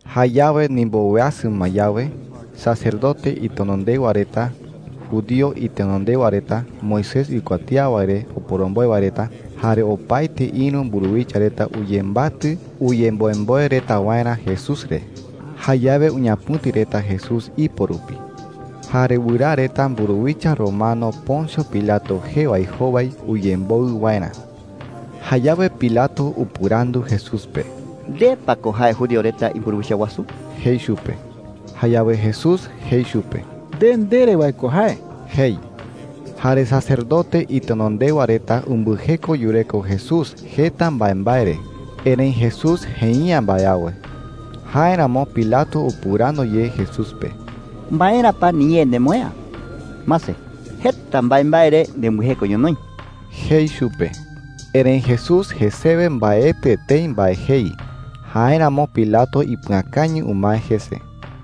Jayawe ndimboweasɨ ma yawe, sacerdote itenondewa reta, judío itenondewa reta, Moisés uikuatía wae re oporomboe wae reta, jare opaete ïru mburuwicha reta uyembatɨ uyemboemboe reta waerä Jesús re. Jayawe uñapɨ̈ti reta Jesús ipo rupi, jare wɨraa reta mburuwicha romano Poncio Pilato jee wae jowai uyemboɨ waerä. Jayawe Pilato upɨrandu Jesús pe: “¿Nde pa ko jae judío reta imburuwicha wasu?” jei chupe. Jayawe Jesús jei chupe: “Nde ndere wae ko jae,” jei. Jare sacerdote itenondewa reta umbɨjeko yureko Jesús jeta mbaembae re, erëi Jesús jei’ä mbae awe. Jáeramo Pilato upɨrandu ye Jesús pe: “¿Maera pa niñee nemoë'ä? Mase, jeta mbaembae re nembɨjeko ñonoï,” jei chupe. Erëi Jesús jesewe mbaetɨ etei mbae jei. Jáeramo Pilato ipɨakañɨ umae jese.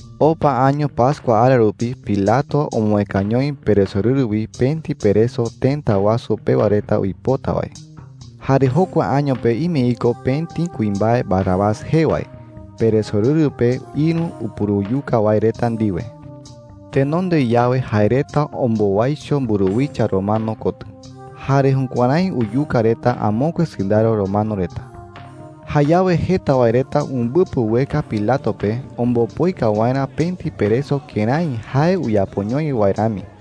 Opa año pascua ara rupi Pilato omoëkañoi peresorɨru wi pëti pereso tëta wasu pewa reta uipota wae. Jare jokua año pe ime iko pëti kuimbae Barrabás jee wae peresorɨru pe ïru upuruyuka wae reta ndiwe. Tenonde yawe jae reta ombowaicho mburuwicha romano kotɨ, jare jukuärái uyuka reta amokue sɨndaro romano reta. Jayawe jeta wae reta umbɨpɨ ueka Pilato pe ombopoika waerä pëti pereso kërái jae uyapoñoi wae rami.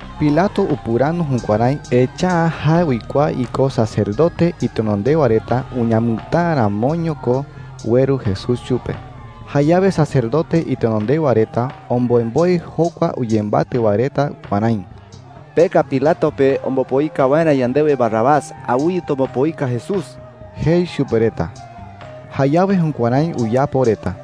Pilato upɨrandu jukuärái, echa’ä jae uikuaa iko sacerdote itenondewa reta uñamɨtäa ramoño ko ueru Jesús chupe. Jayawe sacerdote itenondewa reta omboemboe jokua uyembatɨ wae reta kuärái: “Peka Pilato pe ombopoika waerä yandewe Barrabás. Awɨye tombopoika Jesús,” jei chupe reta. Jayawe jukuärái uyapo reta.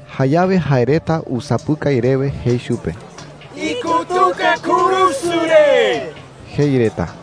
Jayawe jae reta usapɨkai rewe jei chupe: “¡Ikutuka kurusu re!” jei reta.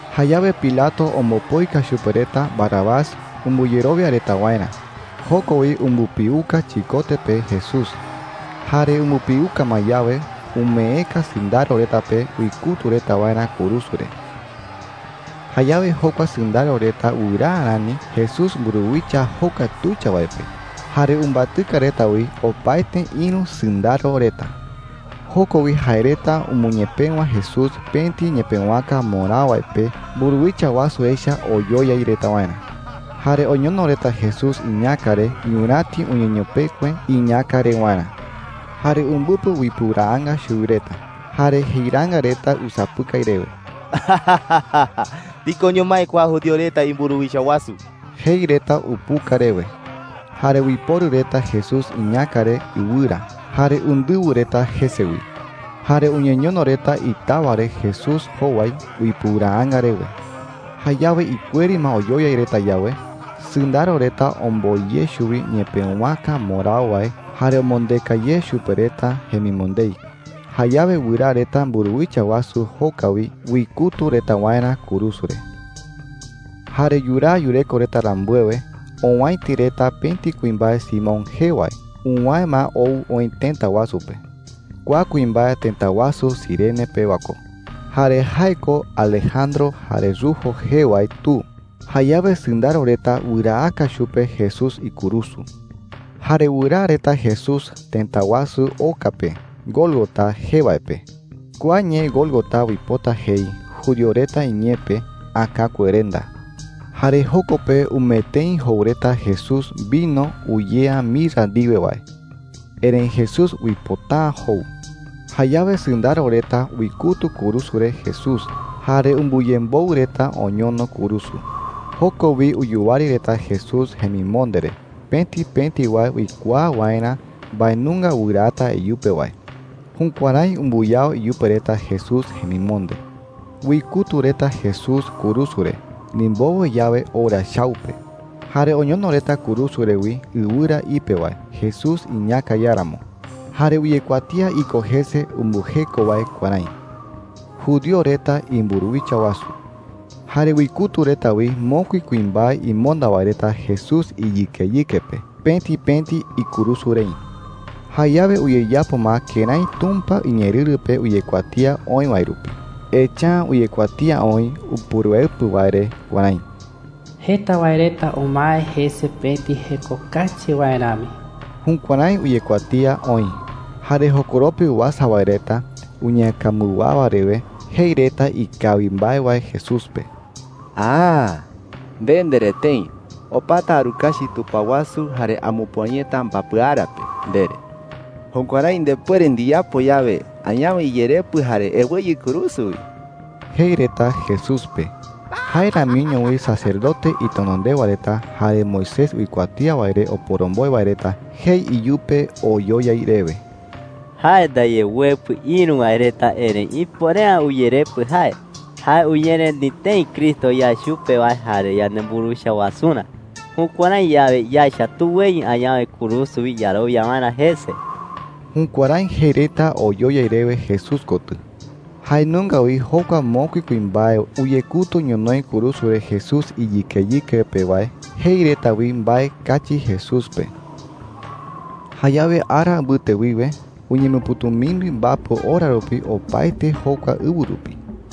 Jayawe Pilato ombopoika chupe reta Barrabás umbɨyerowia reta waerä. Joko wi umbɨpiuka chikote pe Jesús. Jare umbɨpiuka ma yawe, umeeka sɨndaro reta pe uikutu reta waerä kurusu re. Jayawe jokua sɨndaro reta wɨraa rani Jesús mburuwicha joka tuicha wae pe, jare umbatɨka reta wi opaete ïru sɨndaro reta. Joko wi jae reta umɨñepëwa Jesús pëti ñepëwaka mborao wae pe mburuwicha wasu echa oyoyai reta waerä. Jare oñono reta Jesús iñäka re ñuräti uñeñopekue iñäkarewarä. Jare umbɨpɨ uipɨuraanga chuwi reta, jare jeiraanga reta usapɨkai rewe: “¡Tikoño mái kua judío reta imburuwicha wasu!” jei reta upuka rewe. Jare uiporu reta Jesús iñäka re ɨwɨra, jare undɨwɨ reta jese wi. Jare uñeñono reta itawa re Jesús jowai uipɨuraanga rewe. Jayawe ikueri ma oyoyai reta yawe, sɨndaro reta omboi ye chuwi ñepëwaka mborao wae jare omondeka ye chupe reta jemimondei. Jayawe wɨraa reta mburuwicha wasu joka wi uikutu reta waerä kurusu re. Jare yuraa yureko reta rambuewe, owäiti reta pëti kuimbae Simón jee wae uwäe ma ou oï tëta wasu pe. Kua kuimbae tëta wasu Cirene pewa ko, jare jae ko Alejandro jare Rufo jee wae tu. Jayawe sɨndaro reta wɨraaka chupe Jesús ikurusu. Jare wɨraa reta Jesús tëta wasu oka pe Gólgota jee wae pe. (Kua ñee Gólgota uipota jei judío reta iñee pe, “Äkakuerenda.”) Jare joko pe umee tëi jou reta Jesús vino uyea mirra ndiwe wae. Erëi Jesús uipota’ä jou. Jayawe sɨndaro reta uikutu kurusu re Jesús, jare umbɨyemboɨ reta oñono kurusu. Joko wi uyuwari reta Jesús jemimonde re, pëti pëti wae uikuaa waerä mbae nunga wɨraata iyupe wae. Jukuärái umbɨyao iyupe reta Jesús jemimonde. Uikutu reta Jesús kurusu re ndimbowe yawe ora chau pe. Jare oñono reta kurusu re wi ɨwɨra ipe wae Jesús iñäka iáramo. Jare uyekuatía iko jese umbɨjeko wae kuärái: “JUDÍO RETA IMBURUWICHA WASU.” Jare uikutu reta wi mokui kuimbae imonda wae reta Jesús iyɨkeyɨke pe, pëti pëti ikurusu rei. Jayawe uyeyapo ma kërái Tumpa iñeerɨru pe uyekuatía oï wae rupi. Echa’ä uyekuatía oï Upuruepɨ wae re kuärái: “Jeta wae reta umae jese pëti jeko kachi wae rami.” Jukuärái uyekuatía oï. Jare jokoropi uasa wae reta uñeäkambɨwawa rewe jei reta ikawi mbae wae Jesús pe. “¡Aaa!” jei reta. “Nde ndere tëi: ‘Opata arukachi tupao wasu jare amupüa yeta mbapɨ ara pe,’ ndere. Jukuärái ndepuere ndiyapo yawe, añawe iyerepɨ jare eweyɨ kurusu wi,” jei reta Jesús pe. Jae ramiño wi sacerdote itenondewa reta jare Moisés uikuatía wae re oporomboe wae reta jei iyupe oyoyai rewe: “Jae ndaye uepɨ ïru wae reta, erëi ipuere’ä uyerepɨ jae. Jae uñereni tëi Cristo yae chupe wae jare yanemburuwicha wasurä. Jukuärái yawe, yaecha tuweyɨ añawe kurusu wi yarowia waerä jese.” Jukuärái jei reta oyoyai rewe Jesús kotɨ. Jae nunga wi jokua mokui kuimbae uyekutu ñonoï kurusu re Jesús iyɨkeyɨke pe wae jei reta wi mbae kachi Jesús pe. Jayawe ara mbɨte wiwe uñemɨpɨ̈tumimbi mbapɨ ora rupi opaete jokua ɨwɨ rupi.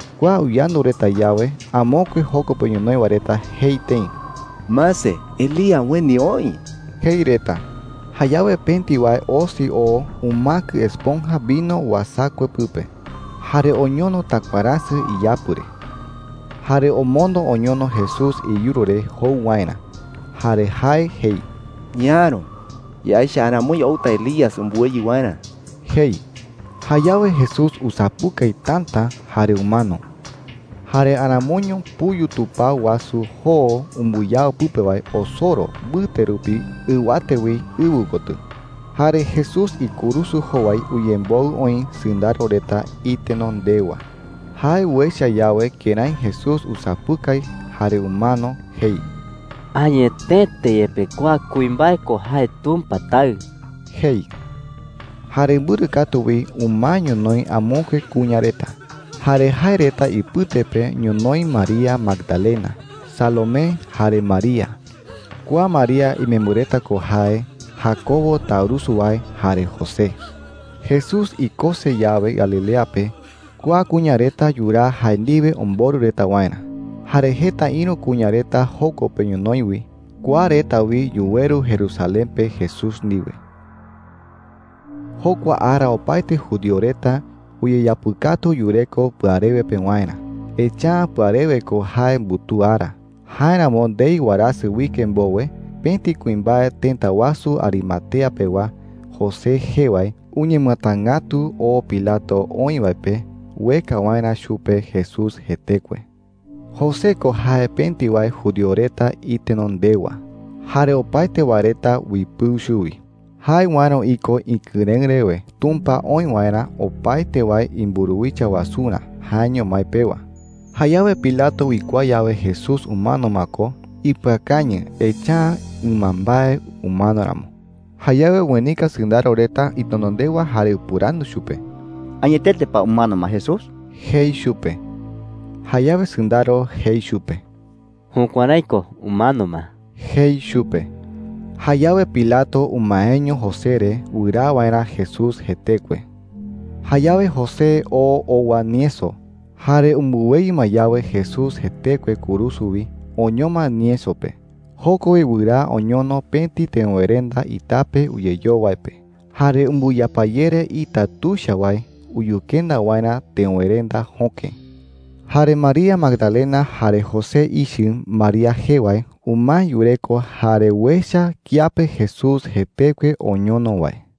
Kua uyandu reta yawe, amokue joko pe ñonoï wae reta jei tëi: “Mase, Elías ueni oï,” jei reta. Jayawe pëti wae osi oo umäkɨ esponja vino uasakue pɨpe, jare oñono takuaräsɨ iyapɨ re, jare omondo oñono Jesús iyuru re jou waerä. Jare jae jei: “Ñaäro. Yaecha aramoi outa Elías umbɨweyɨ waerä,” jei. Jayawe Jesús usapɨkai täta jare umano. Jare aramoiño puyu tupao wasu joo umbɨyao pɨpe wae osoro mbɨte rupi ɨwate wi ɨwɨ kotɨ. Jare Jesús ikurusu jowai uyemboɨ oï sɨndaro reta itenondewa. Jae uecha yawe kërái Jesús usapɨkai jare umano, jei: “Añetete yepe kua kuimbae ko jae Tumpa Taɨ,” jei. Jare mbɨrɨ katu wi umae ñonoï amokue kuña reta. Jare jae reta ipɨte pe ñonoï María Magdalena, Salomé, jare María (kua María imembɨ reta ko jae Jacobo taurusu wae jare José). Jesús ikose yawe Galilea pe, kua kuña reta yuraa jae ndiwe omborɨ reta waerä. Jare jeta ïru kuña reta joko pe ñonoï wi. Kua reta wi yuweru Jerusalén pe Jesús ndiwe. Jokua ara opaete judío reta uyeyapɨkatu yureko pɨarewe pewarä, echa’ä pɨarewe ko jae mbutuu ara. Jáeramo ndei warasɨ uike mbowe, pëti kuimbae tëta wasu Arimatea pewa, José jee wae, uñemɨatangätu oo Pilato oï wae pe ueka waerä chupe Jesús jetekue. José ko jae pëti wae judío reta itenondewa, jare opaete wae reta uipɨu chuwi. Jae uäro iko ikɨrëɨ rewe Tumpa oï waerä opaete wae imburuwicha wasurä jaeño mái pewa. Jayawe Pilato uikuaa yawe Jesús umano ma ko, ipɨakañɨ, echa’ä ɨmambae umano ramo. Jayawe uenika sɨndaro reta itenondewa jare upɨrandu chupe: “¿Añetete pa umano ma Jesús?” jei chupe. Jayawe sɨndaro jei chupe: “Jukuärái ko. Umano ma,” jei chupe. Jayawe Pilato umaeño José re wɨraa waerä Jesús jetekue. Jayawe José oo owa nieso. Jare umbɨweyɨ ma yawe Jesús jetekue kurusu wi, oñoma nieso pe. Joko wi wɨraa oñono pëti teöwerenda itape uyeyoo wae pe, jare umbɨyapayere ita tuicha wae uyukenda waerä teöwerenda jöke. Jare María Magdalena jare José ichɨ María jee wae umae yureko jare uecha kiape Jesús jetekue oñono wae.